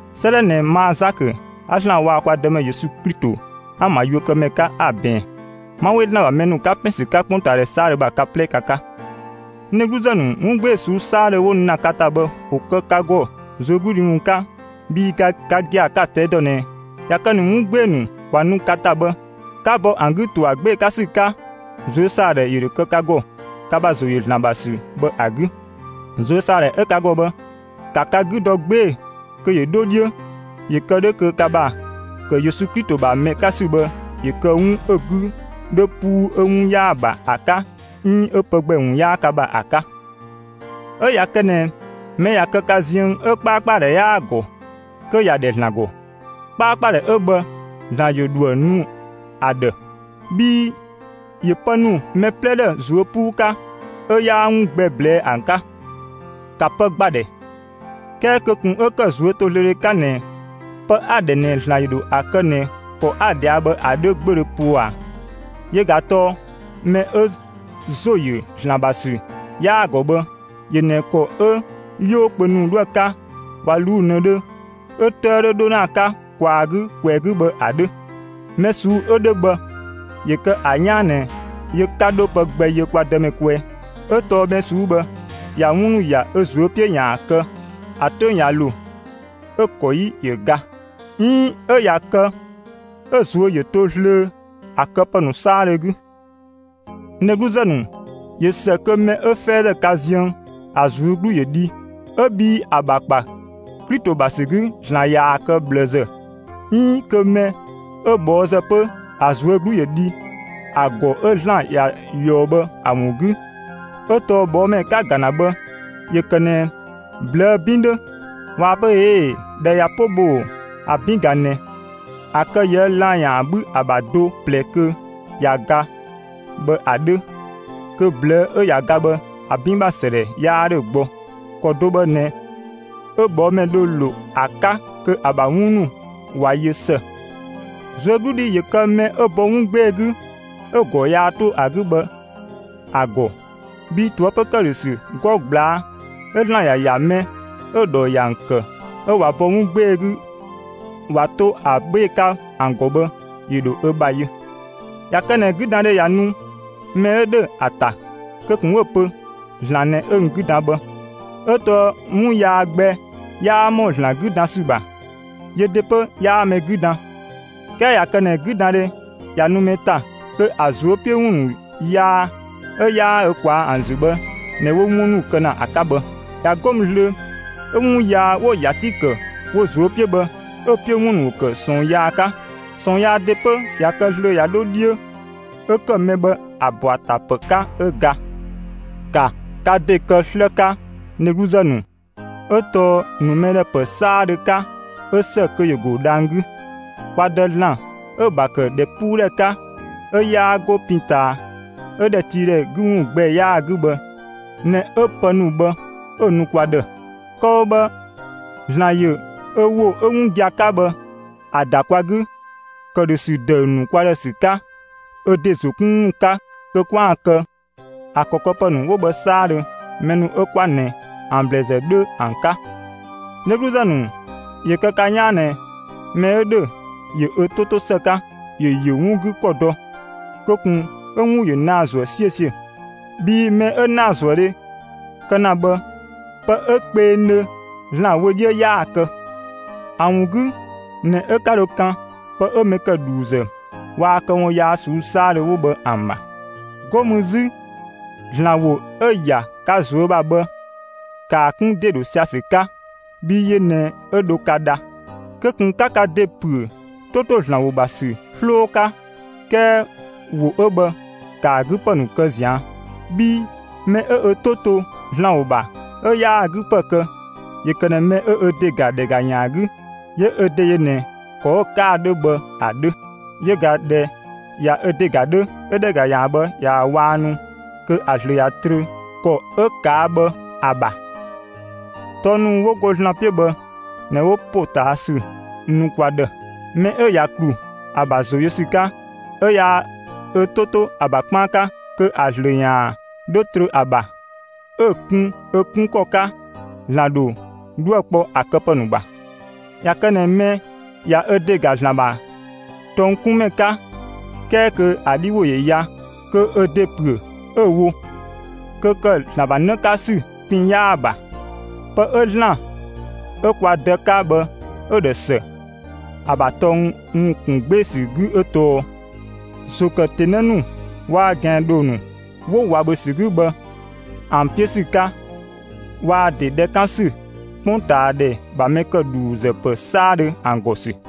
'Sëëdhɛ ꞊nɛ, ma Zakö 'a ‑Zlan waa‑ kwa Dëmɛ Yesu Klito ‑an ‑bha yuökëmɛ 'ka, 'a‑ ꞊bɛɛn. 'Ma 'we ‑Zlan ‑bha mɛ ‑nu, 'ka ‑pɛn ‑sü 'ka 'kpongtaadhɛ 'saadhö ‑bha, ka 'plɛ ka 'ka. N dhegluzë ‑nu, 'wun 'gbee‑ ꞊suu'‑ 'saadhö 'wo nu ‑na ka ‑ta bhë, ‑wo kë ka ‑gɔ ꞊zuögludhi ‑wun 'ka; bhii ka gia‑ 'ka‑ ꞊tɛi' dɔ ꞊nɛ ꞊ya kë ꞊nɛ 'wun 'gbee‑ ‑nu 'wo nu ‑na ka ‑ta bhë, 'ka bɔ ‑an 'gü ‑to ‑a 'gbee‑ 'ka ‑sü 'ka, ꞊zuösaadhɛ ‑yö ‑dhö kë ka ‑gɔ, ka ‑bha ‑zo ‑yö ‑Zlan ‑bha ‑sü bhë ‑a 'gü. ꞊Zuösaadhɛ 'ö ka ‑gɔ bhë, ‑ka ka 'gü dɔ 'gbee‑ kö ‑yö 'dho 'dhiö, ‑yö kë 'dhö kö ka ‑bha ‑kë Yesu Klito ‑bha mɛ 'ka ‑sü bhë ‑yö kë 'wun 'ö‑ 'gü 'dhö 'puu 'ö 'wun 'yaa‑ ‑bha ‑a 'ka 'iin 'ö pë gbɛ ‑wun 'yaa ka ‑bha ‑a 'ka. 'Ö ꞊ya kë ꞊nɛ mɛ ꞊ya kë ka ziën, 'ö 'kpaakpadhɛ 'yaa‑ ‑gɔ, kö ‑ya ‑dhɛ ‑Zlan ‑gɔ. 'Kpaakpadhɛ 'ö bhë ‑Zlan ‑yö ‑dhoë nu ‑a ‑dhë; bhii ‑yö pë ‑nu mɛ 'plɛ ‑dhë ꞊zuö' 'puu 'ka, 'ö 'yaa 'wun gbɛ ꞊blɛɛ'‑ ‑an 'ka. ‑Ka pë ‑gba ‑dhɛ! 'Kɛɛ kö ꞊kun 'ö‑ ‑kë ꞊zuötozlöödhe 'ka ꞊nɛ pë 'a‑ ‑dhɛ ꞊nɛ ‑Zlan ‑yö ‑dho ‑a kë ꞊nɛ ‑kɔ 'a‑ ꞊dhɛa' bhë ‑a 'dhö 'gbödhö poo ꞊a; yö ꞊ga tɔɔ mɛ 'ö ‑zo ‑yö ‑Zlan ‑bha ‑sü 'yaa‑ ‑gɔ bhë, ‑yö ꞊nɛ ‑kɔ 'ö 'yoo kpö ‑nu 'dhoë‑ 'ka 'ö ꞊wa ꞊luu'‑ ꞊nëdhö 'ö 'tëë 'dhö 'dho ‑na ‑a 'ka ꞊kwaa‑ 'gü, ꞊kwɛɛ‑ 'gü bhë ‑a 'dhö. Mɛ ꞊suu'‑ 'ö 'dhö bhë, ‑yö kë ‑a 'yaan ꞊nɛ yö 'ka 'dho pë gbɛ yö kwa Dëmɛ kwɛɛ. 'Ö tɔɔ mɛ ꞊suu'‑ 'ö bhë, ꞊ya 'wun ‑nu ‑ya ö ꞊zuö' 'piö ‑yaan kë, ‑a 'töng ꞊ya ‑lo, 'ö‑ ‑kɔ 'yi ‑yö ga; 'iin 'ö ꞊ya kë 'ö‑ ꞊zuö' ‑yö to zlöö ‑a këpë ‑nu 'saadhö 'gü. N dhegluzë ‑nu, ꞊yö ‑së kö mɛ 'ö 'fɛɛzë ka ziën, ‑a ꞊zuö' 'glu ‑yö dhi ('ö bhii ‑a ‑bha ‑kpa Klito ‑bha ‑sü 'gü) ‑Zlan ꞊yaa‑ kë ꞊bhlëzë, 'iin kö mɛ 'ö ꞊bhɔɔzë 'pö, ‑a ꞊zuö' 'glu ‑yö dhi ‑a ‑gɔ 'ö ‑Zlan ‑ya ꞊yɔɔ bhë ‑a ‑wun 'gü; 'ö tɔɔ ꞊bhɔɔmɛ 'ka‑ ‑ga ‑na bhë, ‑yö ‑kë ꞊nɛ ꞊blëë' 'bin 'dhö; ꞊waa‑ pö: «꞊Ee'‑, ‑dhɛ ꞊ya 'po bhoo‑, ‑an 'bin ꞊ga ꞊nɛ; ‑a kë yië lan‑ ‑yaan 'bhü ‑a ‑bha do, ꞊plɛ, kö ꞊ya ga bhë ‑a 'dhö; kö ꞊blëë' 'ö ꞊ya ga bhë ‑a 'bin ‑bha ‑sëdhɛ 'yaa 'dhö gbɔ.» ‑Kɔ do bhë ꞊nɛ 'ö ꞊bhɔɔmɛ dho ‑lo ‑a 'ka kö ‑a ‑bha 'wun ‑nu ꞊wa yö ‑së. ꞊Zuögludhi ‑yö kë mɛ 'ö bɔ 'wun 'gbee‑ 'gü, 'ö‑ ‑gɔ yaa 'to ‑a 'gü bhë ‑a ‑gɔ, bhii ꞊toëpö ‑këdhösü 'gɔ ꞊gblaa' 'ö ‑Zlan ‑ya ‑ya mɛ 'ö‑ ‑dhɔ ‑yö ‑an ‑kë 'ö ꞊wa bɔ 'wun 'gbee‑ 'gü ꞊wa 'to ‑a 'gbee‑ 'ka ‑an ‑gɔ bhë, ‑yö ‑dho ö ‑bha yö. ꞊Ya kë ꞊nɛ 'güdandhe ꞊ya nu mɛ 'ö ‑dhö ‑a ‑ta, kö ꞊kun 'ö‑ pö: «‑Zlan ꞊nɛ 'ö n 'gü dan bhë», 'ö tɔɔ 'wun yaa gbɛ 'yaa ‑mɔ ‑Zlan 'gü dan ‑sü ‑bha; yö ‑de 'pö 'yaa mɛ 'gü ‑dan. 'Kɛɛ ꞊ya kë ꞊nɛ 'güdandhe ꞊ya nu mɛ ‑ta, kö ‑a ꞊zuö' 'piö ‑wun ‑nu yaa 'ö 'yaa ö ꞊kwaa'‑ ‑an ‑zü bhë ꞊nɛ, 'wo 'wun ‑nu kë ‑na ‑a 'ka bhë. ꞊Ya 'go mü zlöö, 'ö 'wun yaa 'wo‑ ‑ya 'ti ‑kë wo ꞊zuö' 'piö bhë, 'ö‑ 'piö ‑wun ‑yö ‑kë ꞊sɔɔn yaa 'ka; ꞊sɔɔn yaa ‑de 'pö ꞊ya kë zlöö, ꞊ya 'dho 'dhiö, 'ö ‑kë mɛ bhë ‑a ‑bɔ ‑a ‑ta ‑pë 'ka 'ö ga. ‑Ka ka ‑de kë 'slë 'ka, n dhegluzë ‑nu; 'Ö tɔɔ ‑nu mɛ ‑dhë ‑pë 'saadhö 'ka, 'ö ‑së kö ‑yö ‑go dhang‑ 'gü. Kwa Dë ‑Zlan 'ö‑ ‑bha ‑kë ‑dhɛpuudhɛ 'ka, 'ö 'yaa 'go pin ꞊taa, 'ö ‑dhɛtiidhɛ 'gü ‑wun gbɛ 'yaa‑ 'gü bhë ꞊nɛ 'ö pë ‑nu bhë 'ö‑ ‑nu kwa ‑dhë. Kë‑ wo bhë, ‑Zlan ‑yö ö ‑wo 'ö 'wun gia‑ 'ka bhë ‑a ‑da kwa 'gü, ‑këdhösü ‑dëü ‑nu kwa ‑dhë ‑sü 'ka ö ‑de ‑zo 'kun ‑wun 'ka kö 'kwaan‑ kë ‑a ‑kɔ këpë ‑nu 'wo bhë 'saadhö, mɛ ‑nu 'ö 'kwa ꞊nɛ ‑an ‑blɛɛzë 'dhö ‑an 'ka. N dhegluzë ‑nu, ‑yö kë ka 'yaan ꞊nɛ mɛ 'ö ‑dhö ‑yö ö 'to 'to ‑së 'ka, ‑yö ‑yö 'wun 'gü ‑kɔ dɔ; kö ꞊kun 'ö 'wun ‑yö naa‑ ‑zuë 'siösiö, bhii mɛ 'ö ‑naazuëdhe kë ‑na bhë, pë 'ö kpengdhö ‑Zlan wö 'dhiö 'yaa‑ kë. ‑A ‑wun 'gü ꞊nɛ 'ö 'ka dho kan pë 'ö mɛ ‑kë ‑dhuuzë waa‑ këwun yaa ꞊suu'‑ 'saadhö 'wo bhë ‑an ‑bha. 'Go mü 'zü, ‑Zlan ‑wo 'ö‑ ‑ya ka ꞊zuö' ‑bha bhë, ‑kaa 'kun ‑de ‑dho sia‑ ‑sü 'ka, bhii yö ꞊nɛ 'ö dho ka dha. Kö ꞊kun 'ka ka ‑de ‑püö, 'to ‑to ‑Zlan ‑wo ‑bha ‑sü 'sloo 'ka, 'kɛɛ ‑wo 'ö bhë ‑kaa 'gü ‑pë ‑nu kë ꞊zian'. Bhii mɛ 'ö ö 'to to ‑Zlan ‑wo ‑bha 'ö yaa‑ 'gü ‑pë kë, ‑yö ‑kë ꞊nɛ mɛ 'ö ö ‑de ‑ga ‑dhɛgayan 'gü, 'yö ö ‑de yö ꞊nɛ ‑kɔ 'ö‑ 'ka ‑a 'dhö bhë ‑a 'dhö. Yö ꞊ga, ꞊dhɛ ꞊ya ö ‑de ‑ga 'dhö, 'ö ‑dhɛgayan bhë ꞊yaa‑ ꞊waannu kö ‑a ‑zlö ꞊ya trö ‑kɔ 'ö ꞊kaa' bhë ‑a ‑bha. Tɔng ‑nu 'wo go ‑Zlan 'piö bhë ꞊nɛ 'wo ‑potaasü nu kwa ‑dhë. Mɛ 'ö ꞊ya ‑klu ‑a ‑bha ‑zo yö ‑sü 'ka, 'ö 'yaa ö 'to to ‑a ‑bha 'kpaan 'ka, kö ‑a ‑zlö ‑yaan 'dho trö ‑a ‑bha, 'ö‑ kun ö 'kun ‑kɔ 'ka, ‑Zlan ‑dho 'dhuë‑ kpɔ ‑a këpë ‑nu ‑bha. ꞊Ya kë ꞊nɛ mɛ ꞊ya ö ‑de ‑ga ‑Zlan ‑bha tɔng 'kun ‑mɛ 'ka, 'kɛɛ kö ‑a 'dhi ‑wo ‑yö ya, kö ö ‑de ‑püö 'ö‑ wo; kö ‑kë ‑Zlan ‑bha 'në 'ka ‑sü pin 'yaa‑ ‑bha. Pë 'ö ‑Zlan 'ö kwa Dë 'ka bhë 'ö‑ ‑dhë ‑së ‑a ‑bha tɔng ‑wun ‑kun 'gbee‑ ‑sü 'gü 'ö tɔɔ: ‑Zo ‑kë ‑tenë ‑nu waa‑ ꞊gɛandhoo ‑nu 'wo ꞊wa ‑bhö ‑sü 'gü bhë ‑an 'piö ‑sü 'ka waa‑ ‑de ‑dhɛ 'kan ‑sü 'kpongtaadhɛ ‑bha mɛ ‑kë ‑dhuuzë ‑pë 'saadhö ‑an ‑gɔ ‑sü.